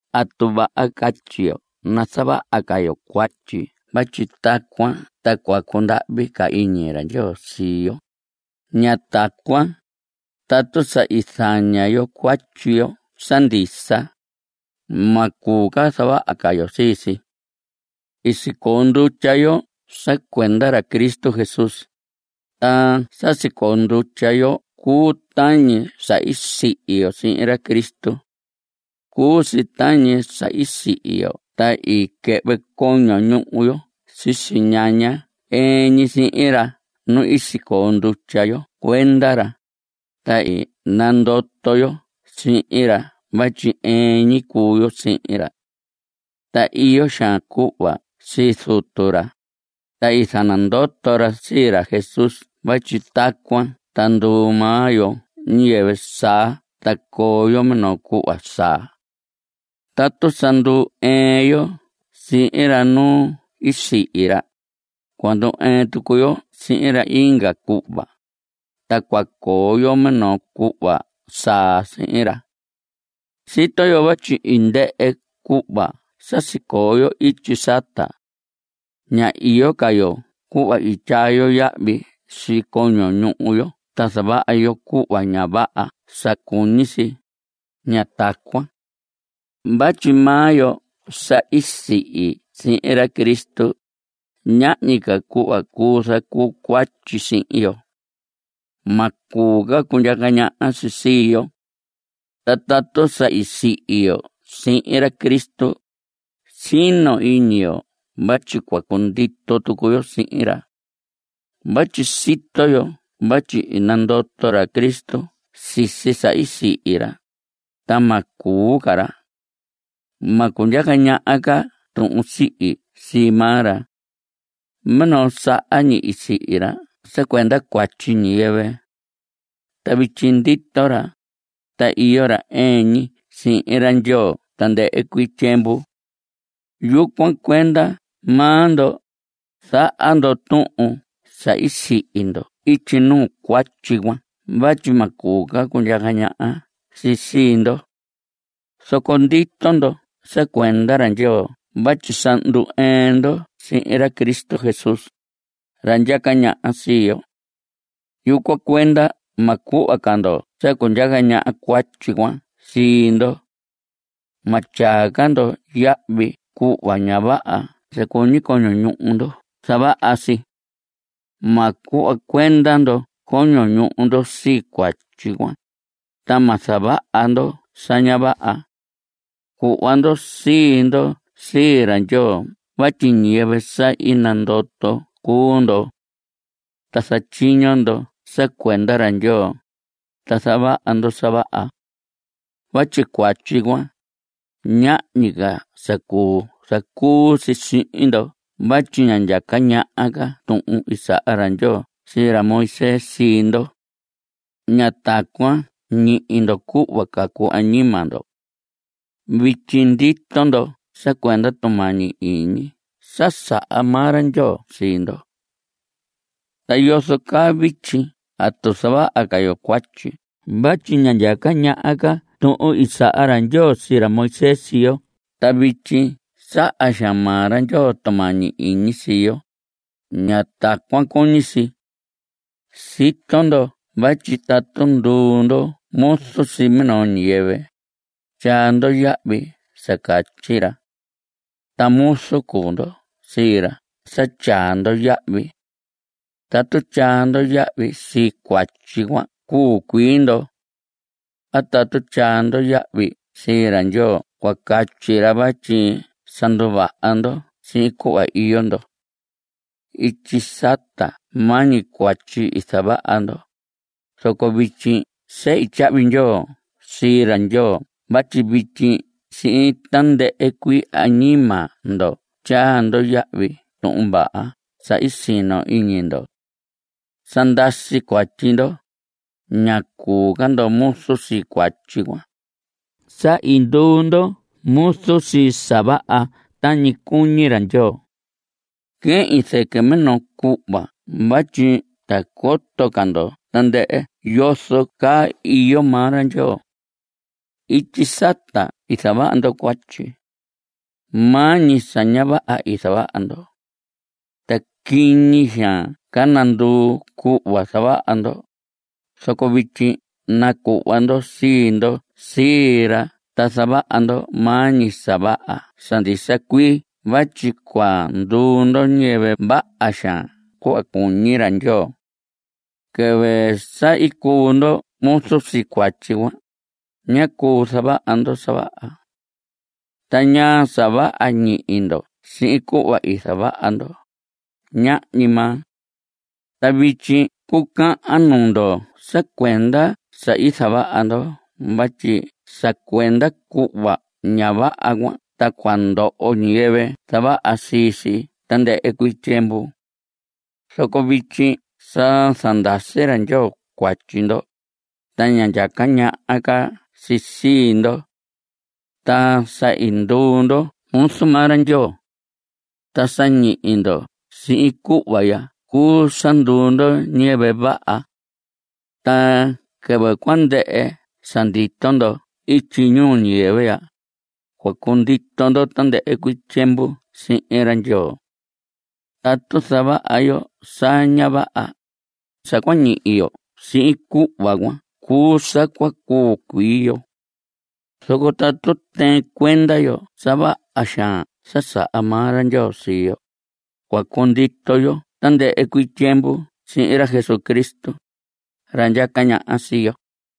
¿Atu vaha catyi yo nazavaha ca yo cuatyi vatyi tacuan ta cua cundahvi ca iñi ra Ndyoo sii yo? Ña tacuan. Tatu sa i zaña yo cuatyi yo sa ndisa, ma cuu ca zavaha ca yo sii si. I sicoo ndutya yo sa cuenda ra Cristo Jesús, ta sa sicoo ndutya yo cuu tañi sa sihi yo sihin ra Cristo. Cuu si tañi sa i sihi yo ta i quɨhvɨ coño ñuhu yo sisi ñaña ɨɨn ñi sihin ra nu i sicoo ndutya yo cuenda ra, ta i nandoto yo sihin ra vatyi ɨɨn ñi cuu yo sihin ra. Ta iyo xaan cuhva sii Zutu ra, ta i zanandoto ra sii ra Jesús vatyi tacuan ta nduu maa yo ñiyɨvɨ saa ta coo yo minoo cuhva saa. Tatu sa ndu‑ɨɨn yo sihin ra nu i sihi ra, cua ndu‑ɨɨn tucu yo sihin ra inga cuhva, ta cua coo yo minoo cuhva saa sihin ra. Sito yo vatyi i ndɨhɨ cuhva sa sicoo ityi sata. Ña iyo ca yo cuhva i tyaa yo yahvi sii coño ñuhu yo ta zavaha yo cuhva ña vaha sa cuñi si. Ña tacuan. Vatyi maa yo sa i sihi sihin ra Cristo, ñahñi ca cuhva cuu zacuu cuatyi sihin yo. Ma cuu ca cundyaca ñaha si sii yo. Ta tatu sa i sihi yo sihin ra Cristo, sino iñi yo vatyi cua cundito tucu yo sihin ra. Vatyi sito yo vatyi i nandoto ra Cristo sisi sa i sihi ra, ta ma cuu ca ra. Ma cundyaca ñaha ca tuhun sihi sii maa ra. Minoo saha ñi i sihi ra sa cuenda cuatyi ñiyɨvɨ. Ta vityi ndito ra. Ta iyo ra ɨɨn ñi sihin ra Ndyoo tandɨhɨ cuii tyiemvu. Yucuan cuenda maa ndo, zaha ndo tuhun sa i sihi ndo ityi nuu cuatyi cuan vatyi ma cuu ca cundyaca ñaha si sii ndo. Zoco ndito ndo sa cuenda ra Ndyoo vatyi sa ndu‑ɨɨn ndo sihin ra Cristo Jesús, ra ndyaca ñaha sii yo. Yucuan cuenda ma cuhva ca ndo sa cundyaca ñaha cuatyi cuan sii ndo. Ma tyaa ca ndo yahvi cuhva ña vaha sa cuñi coño ñuhu ndo zavaha si. Ma cuhva cuenda ndo coño ñuhu ndo sii cuatyi cuan, ta ma zavaha ndo sa ña vaha. Cuhva ndo sii ndo sii ra Ndyoo vatyi ñiyɨvɨ sa i nandoto cuu ndo. Ta zatyiño ndo sa cuenda ra Ndyoo, ta zavaha ndo sa vaha. Vatyi cuatyi cuan, ñahñi ca sa cuu zacuu si sihin ndo vatyi ña ndyaca ñaha ca tuhun i saha ra Ndyoo sii ra Moisés sii ndo. Ña tacuan ñihi ndo cuhva cacu añima ndo. Vityi ndito ndo sa cuenda tumañi iñi sa saha maa ra Ndyoo sii ndo. Ta yozo caa vityi ¿atu zavaha ca yo cuatyi vatyi ña ndyaca ñaha ca tuhun i saha ra Ndyoo sii ra Moisés sii yo ta vityi saha xaan maa ra Ndyoo tumañi iñi sii yo? Ña tacuan cuñi si. Sito ndo vatyi tatu nduu ndo muzu sii minoo ñiyɨvɨ, tyaa ndo yahvi sa catyi ra. Ta muzu cuu ndo sii ra sa tyaa ndo yahvi. Tatu tyaa ndo yahvi sii cuatyi, cua cuu cuii ndo. A tatu tyaa ndo yahvi sii ra Ndyoo cua catyi ra vatyi sa nduvaha ndo sihin cuhva iyo ndo. Ityi sata maa ñi cuatyi i zavaha ndo, zoco vityi sehi tyahvi ndyoo sii ra Ndyoo vatyi vityi sihin tandɨhɨ cuii añima ndo tyaa ndo yahvi Tuhun Vaha sa i sino iñi ndo. Sa ndasi cuatyi ndo. Ña cuu ca ndo muzu sii cuatyi cuan. Sa i nduu ndo muzu sii sa vaha tañi cuñi ra Ndyoo. Quehin zɨquɨ minoo cuhva vatyi ta coto ca ndo tandɨhɨ yozo caa iyo maa ra Ndyoo. Ityi sata i zavaha ndo cuatyi. Maa ñi sa ña vaha i zavaha ndo. Ta quiñi xaan ca nanduu cuhva zavaha ndo. Zoco vityi nacuhva ndo sii ndo sii ra ta zavaha ndo maa ñi sa vaha sa ndisa cuii vatyi cua nduu ndo ñiyɨvɨ vaha xaan cuhva cuñi ra Ndyoo. Quɨvɨ sa i cuu ndo muzu sii cuatyi cuan, ñá cuu zavaha ndo sa vaha. ¿Ta ñaa sa vaha ñihi ndo sihin cuhva i zavaha ndo? Ñahñi maa. Ta vityi cucahan nuu ndo sa cuenda sa i zavaha ndo vatyi sa cuenda cuhva ña vaha cuan ta cua ndoho ñiyɨvɨ zavaha sii si tandɨhɨ cuii tyiemvu. Zoco vityi sa zandasi ra Ndyoo cuatyi ndo, ta ña ndyaca ñaha ca si sii ndo. Ta sa i nduu ndo muzu maa ra Ndyoo. Ta sa ñihi ndo sihin cuhva ya cuu sa nduu ndo ñiyɨvɨ vaha. Ta quɨvɨ cua ndɨhɨ sa ndito ndo ihya ñuu ñiyɨvɨ ya, cua cundito ndo tandɨhɨ cuii tyiemvu sihin ra Ndyoo. Tatu zavaha yo sa ña vaha, sa cua ñihi yo sihin cuhva cuan cuu sa cua cuu cuii yo. Zoco tatu tɨɨn cuenda yo sa vaha xaan sa saha maa ra Ndyoo sii yo, cua cundito yo tandɨhɨ cuii tyiemvu sihin ra Jesucristo, ra ndyaca ñaha sii yo.